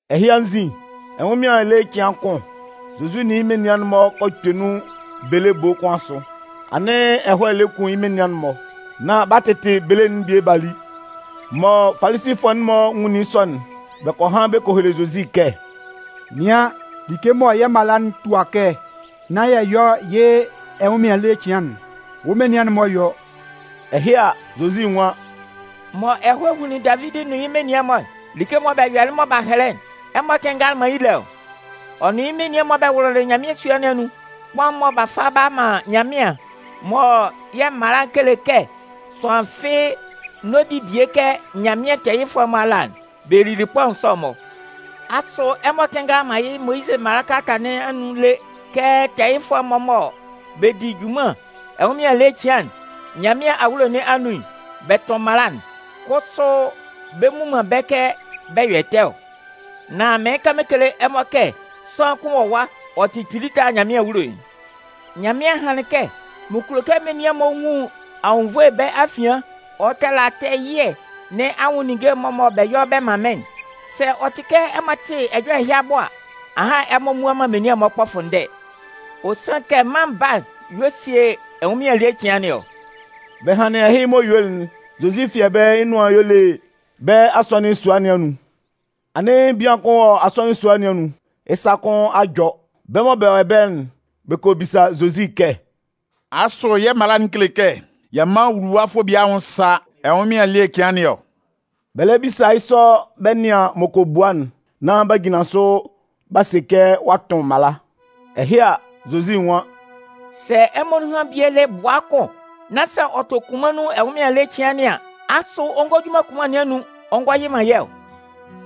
Ɛhɩ anzin, ɛnwʋnmɩan ele cɩan kʋn, Zozi nʋn yɩ́ menian'n-mɔ kɔ kpɛ nun bele ebo kʋn asʋ. Anɩn ɛhɔɛ lɛ kun yɩ́ menian'n-mɔ, nán b'a tɩtɩ bele'n bie b'a li. Mɔ Falisifʋɛ'n-mɔ nwunlin yɩ́ sɔ'n, bɛ kɔ han bɛ kɔ hele Zozi kɛ: “Nɩan, like mɔ yɛ́ mala'n tua yɛ́ kɛ nán yɛ yɔ yɩ́ ɛnwʋnmɩan ele cɩan'n, wɔ́ menian'n-mɔ yɔ.” Ɛhɩ a, Zozi nwan: “Mɔ ɛhɔɛ hunlin Davidi nʋn yɩ́ menian'n-mɔ'n, like'n mɔ bɛ yɔlɩ mɔ b'a hɛlɛ'n, ɛmɔ kɩnngalɩ man yɩ́ lé ɔ? Ɔ nʋn yɩ́ menian'n-mɔ bɛ wʋlʋlɩ Nyanmɩan sua nɩn anun. Kpaʋn'n-mɔ mɔ b'a fa b'a man Nyanmɩan, mɔ yɛ́ mala'n kele kɛ sʋanlan fɩ́ɩ́ n'ɔ di bie kɛ Nyanmɩan tɛɛyɩfʋɛ'n-mɔ ala'n, bɛ lili kpaʋn sɔ'n-mɔ. Asʋ ɛmɔ kɩnngalɩ man yɩ́ Moyizɩ mala nɩn anun lé kɛ tɛɛyɩfʋɛ'n-mɔ mɔ bɛ di junman ɛnwʋnmɩan ele cɩan'n Nyanmɩan awulo nɩn anun'n, bɛ tʋn mala'n, kʋsʋ bɛ mmu man bɛ́ kɛ bɛ yɔ ɛtɛ ɔ? Nan mɩɩn kan mɩn kele ɛmɔ kɛ sʋanlan kʋn wɔ ɛwa, ɔ tɩ kpili tala Nyanmɩan awulo'n. Nyanmɩan hanlɩn kɛ: Mɩn kulo kɛ menian'n-mɔ nwun anwunnvoe bɛ́ afian ɔ tala tɛɛ ɛyɩɛ nɩn anwʋn ninnge'n mɔ bɛ yɔ bɛ man mɩ́n'n. Sɛ ɔ tɩ kɛ ɛmɔ tɩ ɛjɔlɛ ɛhɩ abʋ a, ahan ɛmɔ mmua man menian'n-mɔ kpɔfʋndɛɛ. Ɔ sanlɩn kɛ Mân Baa'n y'ɔ sie ɛnwʋnmɩan ele cɩan nɩn ɔ.” Bɛ hanlɩn ɛhɩ m'ɔ yuelɩ'n, Zozi fi ɛbɛlɛ yɩ́ nʋan y'ɔ le bɛ́ asɔnɩn sua nɩn anun. Anɩn bian kʋn wɔ asɔnɩn sua nɩn anun, yɩ́ sa kʋn a jɔ. Bɛ́ mɔ bɛ wɔ ɛbɛlɛ'n, bɛ kɔ bisa Zozi kɛ: “Asʋ yɛ́ mala'n kele kɛ yɛ mán wuluwafʋɛ bie anwʋn sá ɛnwʋnmɩan ele cɩan nɩn ɔ?” Bɛ lɛ bisa yɩ́ sɔ bɛ nɩan m'ɔ kɔ bua'n, nán b'a jinlan sʋ b'a se kɛ ɔ'a tʋn mala. Ɛhɩ a, Zozi nwan: “Sɛ ɛmɔ anun bie le yɩ́ bʋa kʋn nán sɛ ɔ tɔ kunman nun ɛnwʋnmɩan ele cɩan nɩn an, asʋ ɔ ngɔ ju man kunman nɩn anun ɔ ngɔ yɩ man yɩ́ ɔ?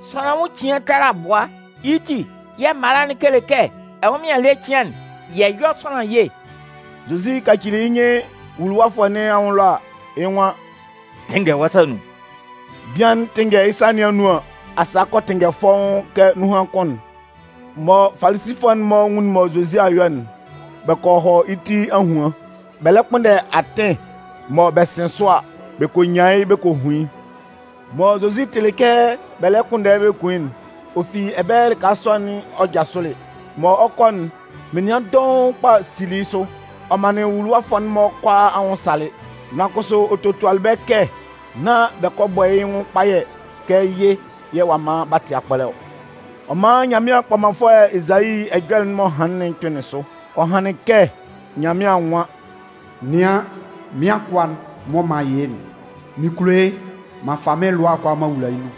Sʋanlan anwʋn cian tala bʋa! Yɩ́ ti, yɛ̂ mala'n kele kɛ ɛnwʋnmɩan ele cɩan'n, yɛ yɔ́ sʋanlan ye.” Zozi kacili yɩ́ nyɩn wuluwafʋɛ nɩn anwʋn ɛlɔ a, yɩ́ nwan: “Tɩnngɛ wɔ́ sa nɩn anun.” Bian'n 'tɩnngɛ yɩ́ sa nɩn anun an, asaa kɔ tɩnngɛ fɔ́ʋ́n kɛ nunhan kʋn'n. Mɔ Falisifʋɛ'n-mɔ nwunlin mɔ Zozi a yɔ'n, bɛ kɔ hɔ yɩ́ ti ahuan, bɛ lɛ kpʋnndɛ atɩn mɔ bɛ sɩn sʋ a, bɛ kɔ nyan yɩ́ bɛ kɔ hun yɩ́'n. Mɔ Zozi tɩlɩ kɛ bɛ lɛ kpʋnndɛ yɩ́ bɛ kun yɩ́'n, ɔ fi ɛbɛlɛ lɩka sɔ'n ɔ jasʋlɩ. Mɔ ɔ 'kɔ'n, menian dɔʋn kpa sili yɩ́ sʋ. Ɔ manlɩn nwuluwafʋɛ'n-mɔ kʋalaa anwʋn salɩ. Nan kʋsʋ ɔ totualɩ bɛ́ kɛ nán bɛ kɔ bɔ yɩ́ nwʋn kpayɛ kɛ yɩ́ yɛ̂ ɔ'a man b'a tɩ akpɔlɛ ɔ. Ɔ man Nyanmɩan kpɔmanfʋɛ Ezayi ɛjɔlɛ'n m'ɔ hanlɩn'n kpɩnlɩn sʋ. Ɔ hanlɩn kɛ Nyanmɩan nwan: Nɩan, mɩ́n akʋa'n mɔ m'an yɩ yɩ́'n, mɩn kulo yɩ́ m'an fa mɩ́n lʋa'n kʋalaa m'an wula yɩ́ nun.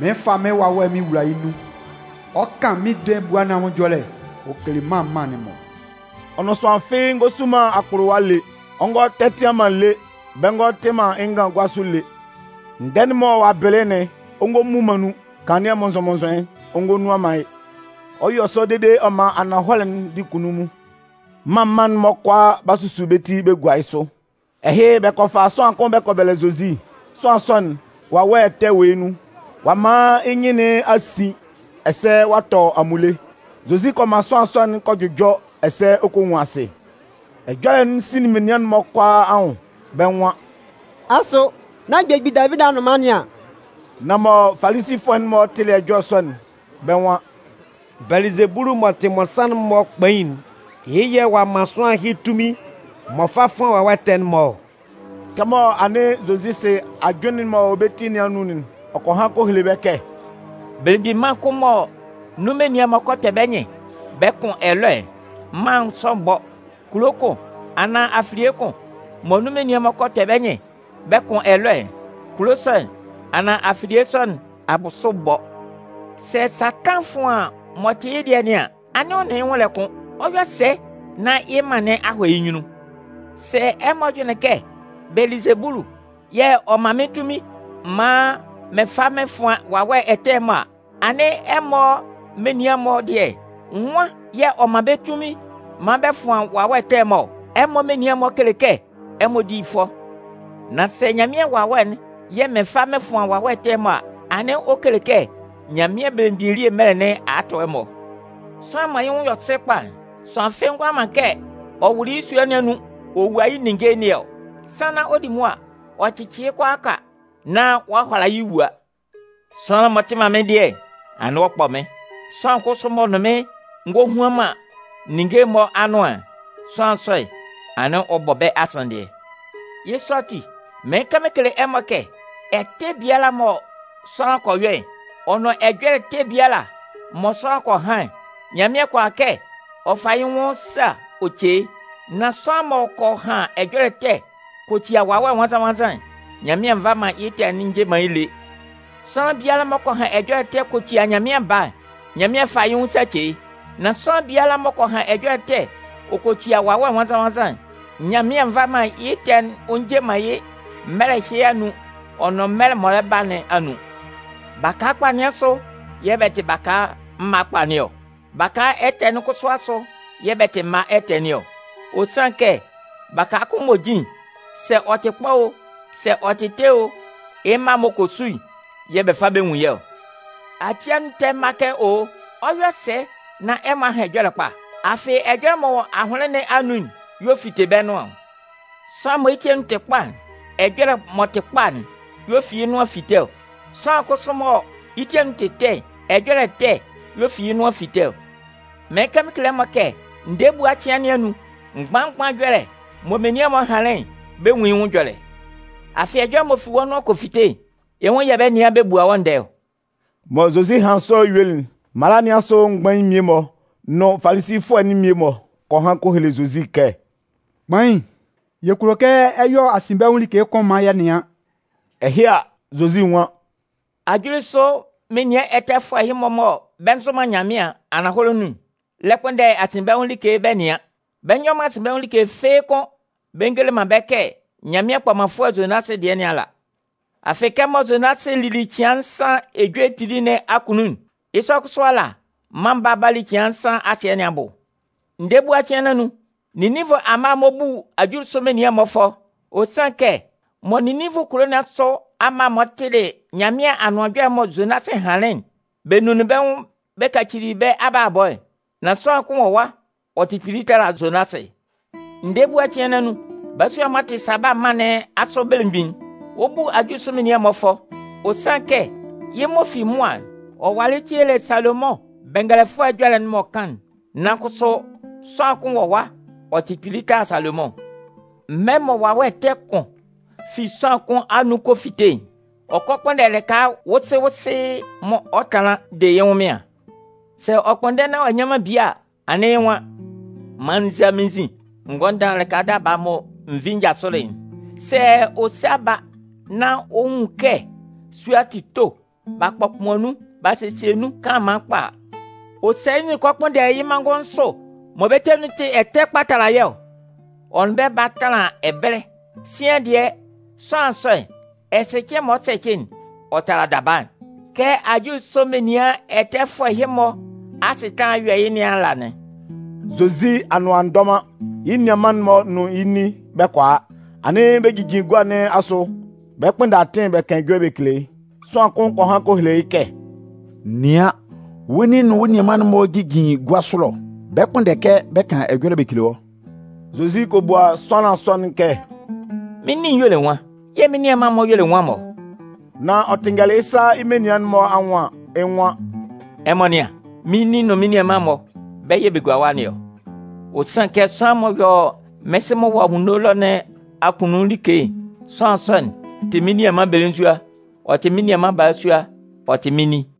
Mɩn 'fa mɩ́n Wawɛ'n mɩn wula yɩ́ nun, ɔ 'kan mɩ́n ndɛɛ ebua nɩn anwʋn ɛjɔlɛ ɔ kele mân mân'n-mɔ. Ɔ nʋn sʋanlan fɩ́ɩ́ bɛ ngɔ su man akpʋlʋwa lé, ɔ ngɔ tɛtɩan man lé, bɛ ngɔ tɩ man yɩ́ ngan gua sʋ lé. Ndɛɛ'n mɔ ɔ'a bɩlɩ'n, ɔ mmu man nun, kanlannɩɛ mʋnnzʋn-mʋnnzʋn'n, ɔ nnuan man yɩ́. Ɔ 'yɔ sɔ dede ɔ man ananhɔlɛ'n di kunnunmun. Mân mân'n-mɔ kʋalaa 'ba susu bɛ́ ti bɛ gua yɩ́ sʋ. Ɛhɩ, bɛ kɔ fa sʋanlan kʋn bɛ kɔ bɛlɛ Zozi. Sʋanlan sɔ'n, wawɛ ɛtɛ wɔ yɩ́ nun, ɔ'a man yɩ́ nyɩn nɩn a sin ɛsɛ ɔ a tɔ amunle. Zozi kɔ man sʋanlan sɔ'n kɔ jʋjɔ ɛsɛ ɔ kɔ nwun asɩ. Ɛjɔlɛ'n sinlin menian'n-mɔ kʋalaa anwʋn, bɛ́ nwan: “Asʋ nán belemgbin Davidi anʋnman nɩn an?” Nan mɔ Falisifʋɛ'n-mɔ tɩlɩ ɛjɔlɛ sɔ'n, bɛ́ nwan: “Bɛlɩzebulu m'ɔ tɩ mmɔnsanmʋn'n-mɔ kpain'n, yɩ́ yɛ̂ ɔ'a man sʋanlan ɛhɩ tunmin m'ɔ fa fʋan wawɛ ɛtɛ'n-mɔ ɔ.” Kɛmɔ anɩn Zozi sɩ ajʋnlɩn'n m'ɔ wɔ bɛ́ ti nɩn anun'n, ɔ kɔ han kɔ hele bɛ́ kɛ: “Belemgbin mân kʋn mɔ nun menian'n-mɔ kpɛ bɛ́ nyɩn bɛ kʋn ɛlɔɛ'n, mân sɔ'n bɔ. Kulo kʋn, anaan afilie kʋn mɔ nun menian'n-mɔ kpɛ bɛ́ nyɩn bɛ kʋn ɛlɔɛ'n, kulo sɔ'n, anaan afilie sɔ nɩn abʋsʋ bɔ. Sɛ Satan fʋan m'ɔ tɩ yɩ́ dɩɛ nɩn an, anɩn ɔ nʋn yɩ́ nwʋn lɛ kʋn, ɔ 'yɔ sɛ nán yɩ́ mân nɩn a hɔ yɩ́ nyunnun? Sɛ ɛmɔ jʋnlɩn kɛ Belɩzebulu yɛ̂ ɔ man mɩ́n tunmin maan mɩn fa mɩn fʋan wawɛ ɛtɛ'n-mɔ a, anɩn ɛmɔ menian'n-mɔ dɩɛ, nwan yɛ̂ ɔ man bɛ́ tunmin maan bɛ fʋan wawɛ ɛtɛ'n-mɔ ɔ? Ɛmɔ menian'n-mɔ kele kɛ ɛmɔ di fʋɔ. Nan sɛ Nyanmɩan Wawɛ'n yɛ̂ mɩn fa mɩn fʋan wawɛ ɛtɛ'n-mɔ a, anɩn ɔ kele kɛ Nyanmɩan Belemgbin elie mɛlɛ nɩn a tʋ ɛmɔ. “Sʋanlan mɔ yɩ́ nwʋn yɔ sɩ kpa'n, sʋanlan fɩ́ɩ́ ngʋala man kɛ ɔ kɔ wʋlʋ yɩ́ sua nɩn anun ɔ wua yɩ́ ninnge nɩn ɔ. Sannan ɔ 'di mʋa ɔ cɩcɩ yɩ́ kʋalaaka nán ɔ'a hʋala yɩ́ wua. “Sʋanlan m'ɔ tɩ man mɩ́n dɩɛ'n, anɩn ɔ kpɔ mɩ́n. Sʋanlan kʋsʋ m'ɔ nʋn mɩn ngohuan man ninnge'n-mɔ anʋan'n, sʋanlan sɔ'n, anɩn ɔ bɔ bɛ́ asanndɩɛ. Yɩ́ sɔ ati, mɩɩn kan mɩn kele ɛmɔ kɛ: Ɛtɛ biala mɔ sʋanlan kɔ yɔ'n, ɔ nʋn ɛjɔlɛ ɛtɛ biala mɔ sʋanlan kɔ han'n, Nyanmɩan kʋala kɛ ɔ fa yɩ́ nwʋn sa ɔ ce yɩ́. Nan sʋanlan m'ɔ kɔ han ɛjɔlɛ ɛtɛ kɔ tia Wawɛ Nwannzan-nwannzan'n, Nyanmɩan nva man yɩ́ ɛtɛ'n ɔ nje man yɩ́ lé. Sʋanlan biala m'ɔ kɔ han ɛjɔlɛ kɔ tia mân Baa'n, Nyanmɩan 'fa yɩ́ nwʋn sa ɔ ce yɩ́. Nan sʋanlan biala m'ɔ kɔ han ɛjɔlɛ ɛtɛ ɔ kɔ tia Wawɛ Nwannzan-nwannzan'n, Nyanmɩan nva man yɩ́ ɛtɛ'n ɔ nje man yɩ́ mɛlɛ ɛhɩ anun ɔ nʋn mɛlɛ'n m'ɔ lɛ ba nɩn anun.” “Baka kpa nɩn asʋ yɛ̂ bɛ tɩ mma kpa nɩn ɔ. Baka ɛtɛ nɩn asʋ kʋsʋ yɛ̂ bɛ tɩ mma ɛtɛ nɩn ɔ. Ɔ sanlɩn kɛ baka kʋn m'ɔ jin'n, sɛ ɔ tɩ kpa o, sɛ ɔ tɩ ɛtɛ o, yɩ́ mma m'ɔ kɔ su'n yɛ̂ bɛ fa bɛ nwun yɩ́ ɔ. Ati anun ɛtɛ mma kɛ owo, ɔ 'yɔ sɛ nán ɛmɔ a han ɛjɔlɛ kpa? Afɩ ɛjɔlɛ m'ɔ wɔ ahʋnlɩn nɩn anun'n, y'ɔ fite bɛ́ nʋan ɔ. Sʋanlan mɔ yɩ́ ti anun tɩ kpa'n, ɛjɔlɛ m'ɔ tɩ kpa'n yɛ̂ ɔ fi yɩ́ nʋan fite ɔ. Sʋanlan kʋsʋ mɔ yɩ́ ti anun tɩ ɛtɛ'n, ɛjɔlɛ ɛtɛ yɛ̂ ɔ fi yɩ́ nʋan fite ɔ. Mɩɩn kan mɩn kele ɛmɔ kɛ: Ndɛɛ ebua cɩan nɩn anun, mgban-mgban ɛjɔlɛ'n mɔ menian'n-mɔ hanlɩn'n, bɛ 'nwun yɩ́ nwʋn ɛjɔlɛ. Afɩ ɛjɔlɛ m'ɔ fi wɔ́ nʋan kɔ fite'n, yɩ́ nwʋn yɛ̂ bɛ 'nɩan bɛ bua wɔ́ ndɛɛ ɔ.” Mɔ Zozi hanlɩn sɔ yuelɩ'n, mala nɩn asʋ mgbain'n mmie-mɔ nʋn Falisifʋɛ'n mmie-mɔ kɔ han kɔ hele Zozi kɛ: “Kpain, yɛ kulo kɛ ɛ yɔ asinbɛnwʋn like kʋn maan yɛ nɩan.” Ɛhɩ a, Zozi nwan: “Ajulisʋ menian ɛtɛfʋɛ ɛhɩ-mɔ mɔ bɛ nzʋ man Nyanmɩan ananhɔlɛ nun'n lɛ kpʋnndɛ asinbɛnwʋn like bɛ nɩan. Bɛ nyɔ man asinbɛnwʋn like fɩ́ɩ́ kʋ́n bɛ ngele man bɛ́ kɛ Nyanmɩan kpɔmanfʋɛ Zonasɩ dɩɛ nɩn ala. Afɩ kɛmɔ Zonasɩ lili cɩan nsan ejue kpili nɩn akunnun'n, yɩ́ sɔ kʋsʋ ala, Mân Baa'n 'ba li cɩan nsan asɩɛ nɩn abʋ. Ndɛɛ ebua cɩan nɩn anun, Ninninvʋ amma'n-mɔ 'bu ajulisʋ menian'n-mɔ fʋɔ. Ɔ sanlɩn kɛ mɔ Ninninvʋ kulo nɩn asʋ amma'n-mɔ tɩlɩ Nyanmɩan Anʋan Ɛjɔlɛ'n mɔ Zonasɩ hanlɩn'n, bɛ nunlin bɛ́ nwʋn bɛ kacili bɛ́ abalabɔ'n. Nan sʋanlan kʋn wɔ ɛwa, ɔ tɩ kpili tala Zonasɩ. Ndɛɛ ebua cɩan nɩn anun, balasua'n m'ɔ tɩ Saba mân nɩn asʋ belemgbin'n, ɔ 'bu ajulisʋ menian'n-mɔ fʋɔ. Ɔ sanlɩn kɛ yɩ́ m'ɔ fi mʋa'n, ɔ walɩ tielɩ Salomʋn bɛngɛlɛfʋɛ ɛjɔlɛ'n m'ɔ kan'n. Nan kʋsʋ sʋanlan kʋn wɔ ɛwa, ɔ tɩ kpili tala Salomʋn. “Mɛlɛ mɔ wawɛ ɛtɛ kʋn fi sʋanlan kʋn anun kɔ fite'n, ɔ kɔ kpʋnndɛ lɩka wʋwʋsɩɩ'n-mɔ ɔ tanlan de yɩ́ ɛnwʋnmɩan. Sɛ ɔ kpʋnndɛ nán ɔ'a nnyan man bie a, anɩn yɩ́ nwan: ‘Man n zá mɩ́n nzin n gɔ́ mɩ́n lɩka daba'n mɔ n vi n jasʋlɩ'n.’ Sɛ ɔ sa ba nán ɔ nwun kɛ sua'n tɩ to, b'a kpɔkpʋan nun b'a sesie nun kanlanman kpa a, ɔ sa yɩ́ nzin ɔ kɔ kpʋnndɛ yɩ́ manngʋn nsʋ mɔ bɛ́ ti anun tɩ ɛtɛ kpa bɛ tala yɩ́ ɔ. Ɔ nʋn bɛ ba a tanlan ɛbɛlɛ. Sian dɩɛ, sʋanlan sɔ'n, ɛsɛcɩɛ m'ɔ kɔ sɛcɩ'n, ɔ tala daba'n. Kɛ ajulisʋ menian ɛtɛfʋɛ ɛhɩ-mɔ asɩtanlan'n 'yɔ yɩ́ nɩn ala anɩn.” Zozi anʋan a ndɔ man, yɩ́ nianman'n-mɔ nʋn yɩ́ nin bɛ kɔ a. Anɩn bɛ jijin gua nɩn asʋ bɛ 'kpʋnndɛ atɩn bɛ kan ɛjɔlɛ bɛ kele yɩ́. Sʋanlan kʋn kɔ han kɔ hele yɩ́ kɛ: “Nɩan, wɔ́ nin nʋn wɔ́ nianman'n-mɔ jijin gua sʋ ɛlɔ bɛ 'kpʋnndɛ kɛ bɛ kan ɛjɔlɛ bɛ kele wɔ́.” Zozi kɔ bua sʋanlan sɔ'n kɛ: “Mɩ́n nin'n y'ɔ le nwan, yɛ̂ mɩn nianman'n-mɔ y'ɔ le nwan-mɔ?” Nan ɔ tɩnngɛlɩ yɩ́ sa yɩ́ menian'n-mɔ anwʋn an, yɩ́ nwan: “Ɛmɔ nɩ́an, mɩ́n nin nʋn mɩ́n nianman'n-mɔ, bɛ́ yɛ̂ bɛ gugua ɛwa nɩn ɔ. Ɔ sanlɩn kɛ sʋanlan m'ɔ yɔ mɩ́n Sɩ'n m'ɔ wɔ anwunno ɛlɔ nɩn akunnun like'n, sʋanlan sɔ'n tɩ mɩ́n nianman belenzua, ɔ tɩ mɩ́n nianman balasua, ɔ tɩ mɩ́n nin.”